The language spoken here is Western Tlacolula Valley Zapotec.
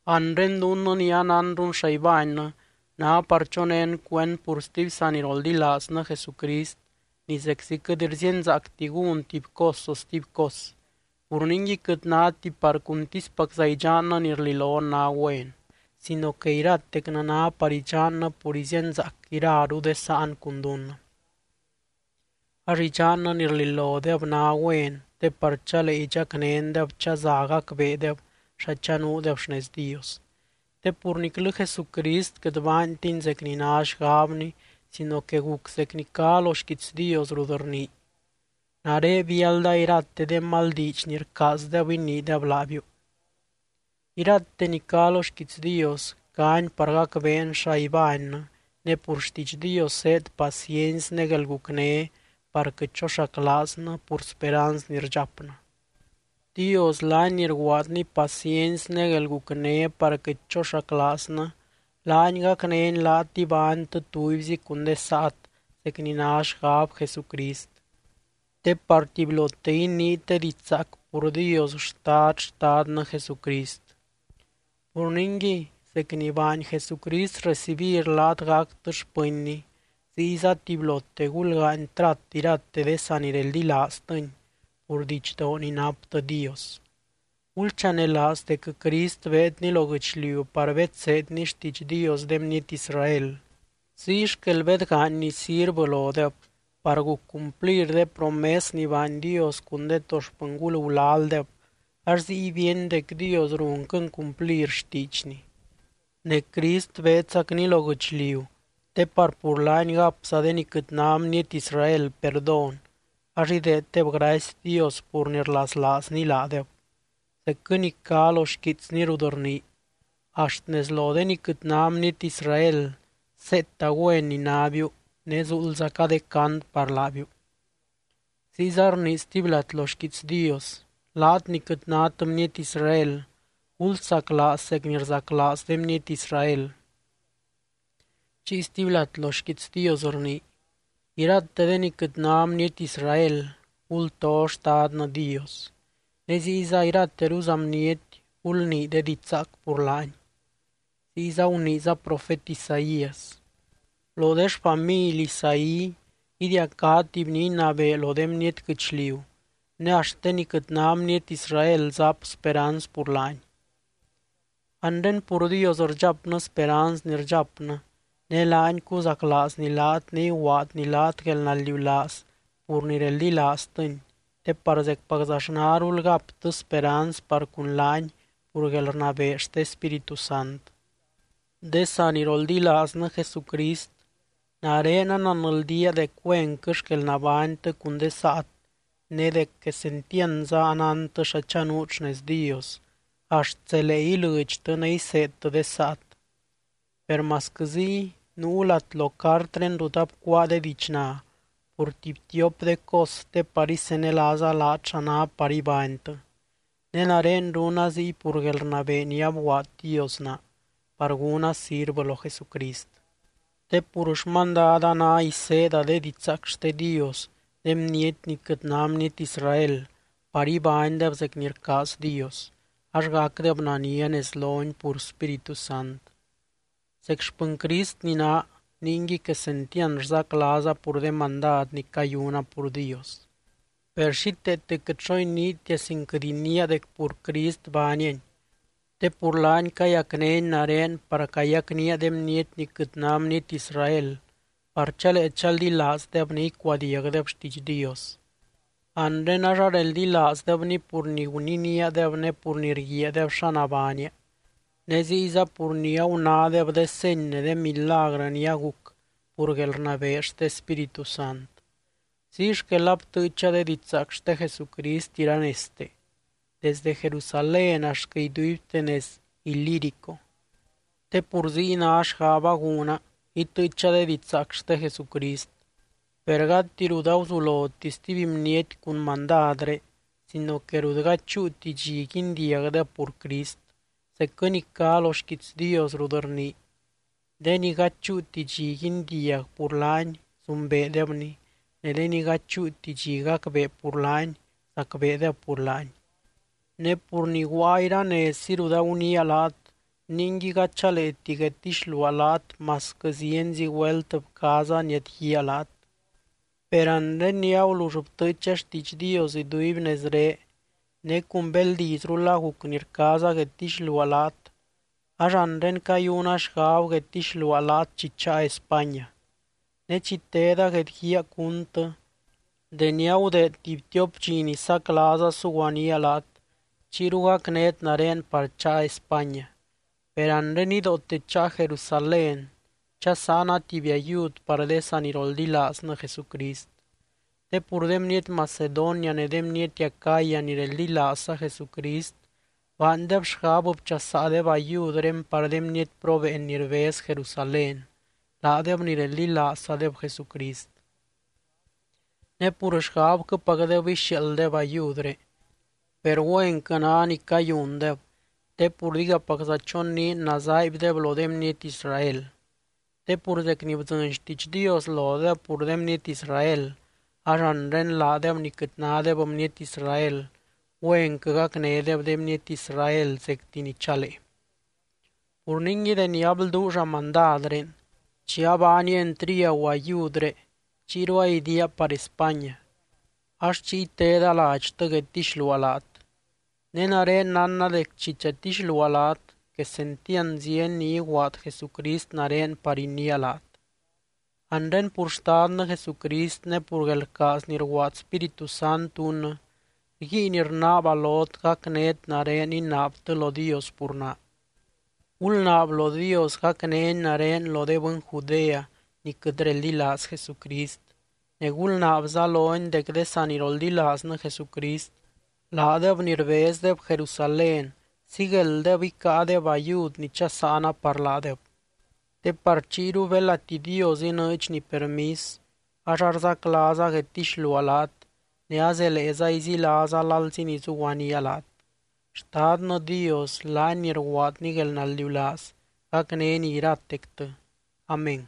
Anre dunnɨ ni anánrun xa ibánnɨ, ná par chonén cuend pur stuby saniroldilaaznɨ Jesucrist ni zeczi quɨt rzíenzaacti gún tuby cos o stuby cos. Pur ningui quɨt náti par cuntispacza idxannɨ ni rililon ná güen, sino que iratecnɨ ná par idxannɨ pur izíenzaac iraru de sáan cun dunnɨ. Ax idxannɨ ni rlilodeb ná güen te par chalee idxacnéndeb chaza gacbeedeb xa chanuudeb xnez Dios. Te pur niclɨ Jesucrist quɨt baantiny zec ni ná xgabny sino que guc zec ni cá lo xquiits Dios rut rnii: “Nare biálda irate de mal diidx ni rcaazdeb iniideb laabiu.” Irate ni cá lo xquiits Dios, cáni par gacbeen xa ibánnɨ, ne pur xtiidx Dios zéed paciency ne guelgucné par quɨt choxaclaaznɨ pur speranz ni rdxapnɨ. Dios laany ni rguaadny paciency ne guelgucné par quɨt choxaclaaznɨ, laany gacnény laat ibánytɨ tubyzi cun de saat zec ni ná xgab Jesucrist. Te par tubylote iniit de diidx zaac pur Dios Xtad Xtadnɨ Jesucrist. Pur ningui, zec ni baany Jesucrist recibir laat gactɨ xpɨnny, ziyza tubylote gulgaany trat irate de sanireldilaaztɨny pur didxdoo ni naptɨ Dios. Gulchanelaaz dec Crist beedny lo guɨchliu par bedseedny xtiidx Dios de bniety Israel, ziy xquel bedgaanyny sirvɨ lodeb, par guc cumplir de promes ni baany Dios cun de to xpɨngul gulaldeb ax ziy bíeny dec Dios runquɨny cumplir xtiidxny. Ne Crist beedzacny lo guɨchliu te par pur laany gapza de ni quɨt ná bniety Israel perdón ax ideeddeb gracy Dios pur ni rlaslaazny laadeb, zecquɨ ni cá lo xquiitsny rut rnii: Axt nez lo de ni quɨt ná bniety Israel seeta güen ni nábiu ne zuuldzaca de cant par laabiu. Ziyza rnii stuby lat lo xquiits Dios: Laat ni quɨt nát bniety Israel, gulsaclaaz zec ni rzaclaaz de bniety Israel. Chiy stuby lat lo xquiits Dios rnii: Irate de ni quɨt ná bniety Israel, gulto Xtadnɨ Dios. Ne ziyza irateruza bniety, gulnii de diidx zaac pur laany. Ziyza guniiza profet Isaías: Lo de xfamily Isaí idiacá tuby ni inabee lo de bniety guɨchliu, ne axt de ni quɨt ná bniety Israel zap speranz pur laany. Anre pur Dios rdxapnɨ speranz ni rdxapnɨ, ne laany cuzaclaazny laat ne iguaadny laat guelnaldiulaaz pur ni reldilaaztɨny te par zecpaczaxnarul gaptɨ speranz par cun laany pur guelrnabee xte Spíritu Sant. De saniroldilaaznɨ Jesucrist, nare ananldía dec güenquɨ xquel nabánytɨ cun de saat ne dec quesentiandza anántɨ xa chanuut xnez Dios, axt zelee ilɨdxtɨ ne iseedtɨ de saat. Per masquɨ ziy, nuu lat lo cartré rut abcuáa de diidxna pur tuby tiop de cos te par isenelaaza laat xa ná par ibánytɨ. Ne nare runa ziy pur guelrnabee ni abguaad Dios naa, par gúna sirvɨ lo Jesucrist. Te pur xmandada ná iseeda de didxzaac xte Dios de bniety ni quɨt ná bniety Israel par ibánydeb zec ni rcaaz Dios, ax gacdeb nania nez lony pur Spíritu Sant. Zec xpɨny Crist ni naa, ningui quesentiand rzaclaaza pur de mandad ni cayuna pur Dios. Per xíteete quɨt xo iniitia sin quɨt iniia dec pur Crist baaniani, te pur laany cayacnény nare par cayacnía de bniety ni quɨt ná bniety Israel par chalee chaldilaazdeb ne icuadiagdeb xtiidx Dios. Anre ax areldilaazdebny pur ni guniníadeb ne pur ni rguiaadeb xa nabánia, ne ziyza pur ni agunádeb de seny ne de milagrɨ ni aguc pur guelrnabee xte Spíritu Sant. Ziy xquel abtɨɨcha de didxzaac xte Jesucrist iranezte, desde Jerusalén axtquɨ iduibte nez Ilírico. Te pur ziy ná xgaba gúna, itɨɨcha de didxzaac xte Jesucrist. Per gati rut aguzuloti stuby bniety cun mandadré sino que rut gady chúuti dxi guindiagdeb pur Crist, zecquɨ ni cá lo xquiits Dios rut rnii: De ni gady chúuti dxi guindiag pur laany, zumbeedebny. Ne de ni gady chúuti dxi gacbee pur laany, zacbeedeb pur laany. Ne pur ni guaa iranezzi rut aguniia laat, ningui gady chaleeti guedtixluaa laat masquɨ zienzi güelt bcaaza niadguíaa laat. Per anre ni agulull btɨɨcha xtiidx Dios iduiby nezré ne cun beldizrul aguc ni rcaaza guedtixluaa laat, ax anre cayuna xgab guedtixluaa laat chi cháa España. Ne chi teda guedguíaa cúntɨ, deni agudeed tuby tiop dxi ni saclaaza suguaníaa laat chiyru gacnét nare par cháa España. Per anre nidoote cháa Jerusalén chasáana tuby ayud par de saniroldilaaznɨ Jesucrist. Te pur de bniety Macedonia ne de bniety Acaya ni reldilaazza Jesucrist baandeb xgab bchasaadeb ayudré par de bniety probeen ni rbez Jerusalén, laadeb ni reldilaazzadeb Jesucrist. Ne pur xgabquɨpacdeb ixiaalddeb ayudré, per güenquɨ ná ni cayundeb te pur digapacza choniin nazaaibdeb lo de bniety Israel. Te pur zec ni bdzɨny xtiidx Dios lodeb pur de bniety Israel, ax anre laadeb ni quɨt nádeb bniety Israel, güenquɨ gacnédeb de bniety Israel zecti ni chalee. Pur ningui deni ablduulla mandadré, chi abaania entriagu ayudré chiyru aidiaa par España, ax chiy teda ladxtɨ guedtixluaa laat. Ne nare nánna dec chi chatixluaa laat, quesentiand zieny ni iguaad Jesucrist nare par iniia laat. Anre pur Xtadnɨ Jesucrist ne pur guelrcaaz ni rguaad Spíritu Sant dunnɨ, rguiin rnaaba lot gacnét nare inaabtɨ lo Dios pur naa. Gulnaab lo Dios gacnény nare lo de bɨny Judea ni quɨt reldilaaz Jesucrist, ne gulnaabza lony dec de saniroldilaaznɨ Jesucrist, laadeb ni rbezdeb Jerusalén síguelddeb icáadeb ayud ni chasáana par laadeb. Te par chiyru belati Dios inɨɨdxny permis ax arzaclaaza guedtixluaa laat ne azeleeza izilaaza lalzi ni zuguaníaa laat. Xtadnɨ Dios laany ni rguaadny guelnaldiulaaz gacnény iratectɨ. Amén.